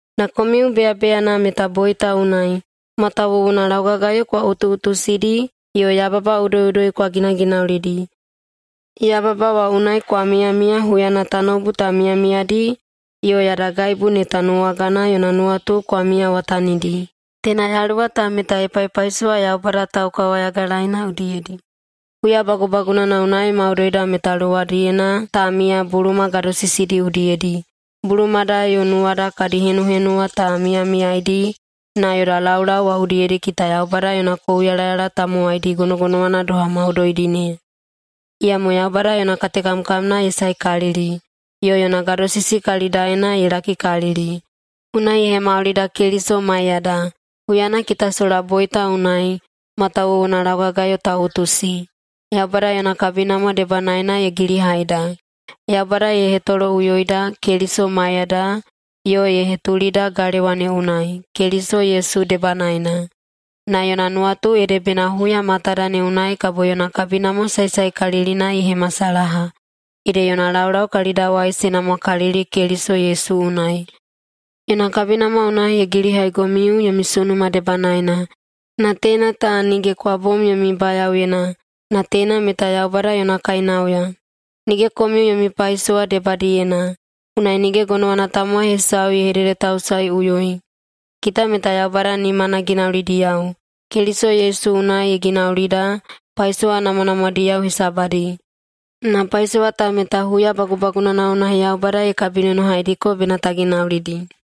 Na komiu beyabeyana meta boita unai, matawuwuna laugagayo kwa utuꞌutusidi yo yababa udoiꞌudoi kwa ginaginaulidi. Yababa wa unai kwa miyamiya huyana tanoubu ta miyamiyadi yo yadagaibu ne tanuwagana yona nuwatu kwa miyawatanidi. Teina yaluwa ta meta ye paipaisowa Yaubada taukawayagalaeina udiyedi. Huya bagubagunana unai maudoida meta luwadiyena ta miya buluma gadosisidi udiyedi. Bulumada yo nuwada kadi henuhenuwa ta miyamiyaidi na yoda laulau wa udiyedi kita Yaubada yona kouyalayala tamowaidi gonogonowana doha maudoidi ne. Iyamo Yaubada yona katekamkamna ye saekalili, yo yona gadosisi kalidaena ye lakikalili. Unai ye hemaulida Keliso maiyada, huyana kita sola boita unai matawuwuna laugagayo ta utusi. Yaubada yona kabinamwa debanaena ye gilihaida. Yaubada ye hetoloꞌuyoida Keliso maiyada yo ye hetulida galewa ne unai, Keliso Yesu debanaena, na yona nuwatu ede bena huya matada ne unai kabo yona kabinamwa saesaekalilina ye hemasalaha, ede yona laulau kalidawai se namwakalili Keliso Yesu unai. Yona kabinamwa unai ye gilihaigomiu yomi sunuma debanaena, na teina ta nige kwa bom yomi bayaoyena, na teina meta Yaubada yona kainauya. Nige komiu yomi paisowa debadiyena, unai nige gonowana tamowai hesau ye hededetausaeꞌuyoi. Kita meta Yaubada nimana ginaulidiyao. Keliso Yesu unai ye ginaulida paisowa namwanamwadiyao hesabadi. Na paisowa ta meta huya bagubagunana unai Yaubada ye kabinonohaidiko bena ta ginaulidi.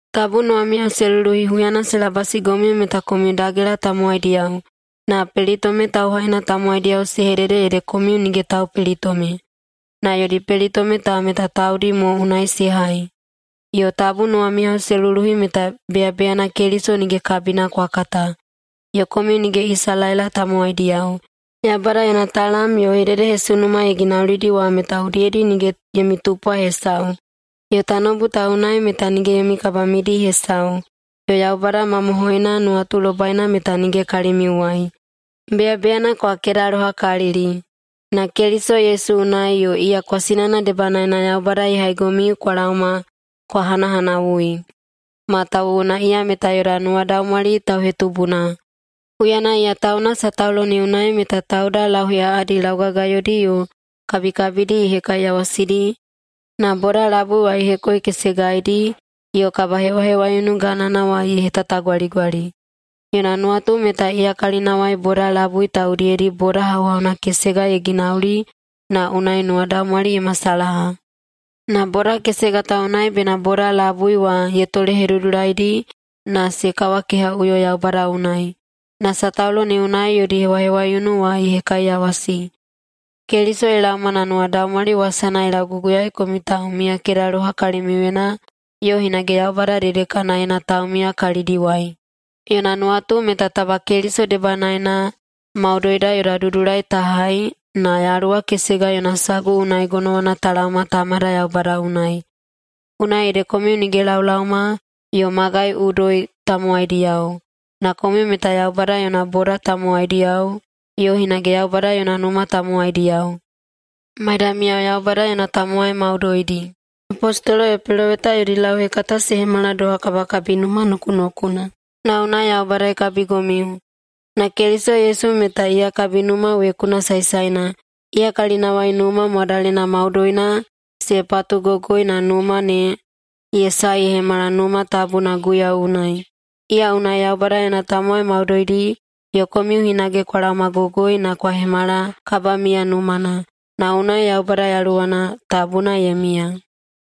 Tabu nuwamiyao se luluhi huyana se labasigomiu meta komiu dagela tamowaidiyao, na pelitome tauhaina tamowaidiyao se hedede ede komiu “nige taupelitome”. Na yodi pelitome ta meta taudi mo unai se hai. Yo tabu nuwamiyao se luluhi meta beyabeyana Keliso nige kabina kwa kata, yo komiu nige Isalaela tamowaidiyao. Yaubada yona talam yo hededehesunuma ye ginaulidi wa meta udiyedi nige yomi tupwa hesau, yo tanoubu ta unai meta nige yomi kabamidi hesau, yo Yaubada mamohoina nuwatulobaina meta nige kalimiuwai. Beyabeyana kwa kedalohakalili. Na Keliso Yesu unai yo iya kwasinana debanaena Yaubada ye haigomiu kwa laoma kwa hanahanawui. Matawuwuna iya meta yoda nuwadaumwali tauhetubuna. Huyana iya tauna sataulo ne unai meta tauda lauheꞌaꞌadi laugagayodi yo kabikabidi ye hekaiyawasidi na boda labui wa ye hekoikesegaidi yo kabahewahewaiunu ganana wa ye hetatagwaligwali. Yona nuwatu meta iya kalinawai boda labui ta udiyedi boda hauhauna kesega ye ginauli na unai nuwadaumwali ye masalaha. Na boda kesega ta unai bena boda labui wa ye tolehedudulaidi na se kawakehaꞌuyo Yaubada unai. Na sataulo ne unai yodi hewahewaiunu wa ye hekaiyawasi. Keliso ye laoma na nuwadaumwali wasana ye lauguguyaei komiu taumiyakedaloha kalimiuyena yo hinage Yaubada dedekanaena taumiya kalidiwai. Yona nuwatu meta taba Keliso debanaena maudoida yoda dudulai ta hai na Yaluwa kesega yona sagu unai gonowana ta laoma Tamada Yaubada unai. Unai ede komiu nige laolaoma yo magai udoi tamowaidiyao, na komiu meta Yaubada yona boda tamowaidiyao yo hinage Yaubada yona numa tamowaidiyao, maidamiyao Yaubada yona tamowai maudoidi. Apostolo yo peloweta yodi lauhekata se hemala doha kabakabinuma nokunokuna, na unai Yaubada ye kabigomiu, na Keliso Yesu meta iya kabinuma wekuna saesaena. Iya kalinawai numa mwadalena maudoina se patugogoi na numa ne ye sae ye hemala Numa Tabuna Guiyau unai. Iya unai Yaubada yona tamowai maudoidi yo komiu hinage kwa laomagogoi na kwa hemala kabamiya numana, na unai Yaubada Yaluwana Tabuna ye miya.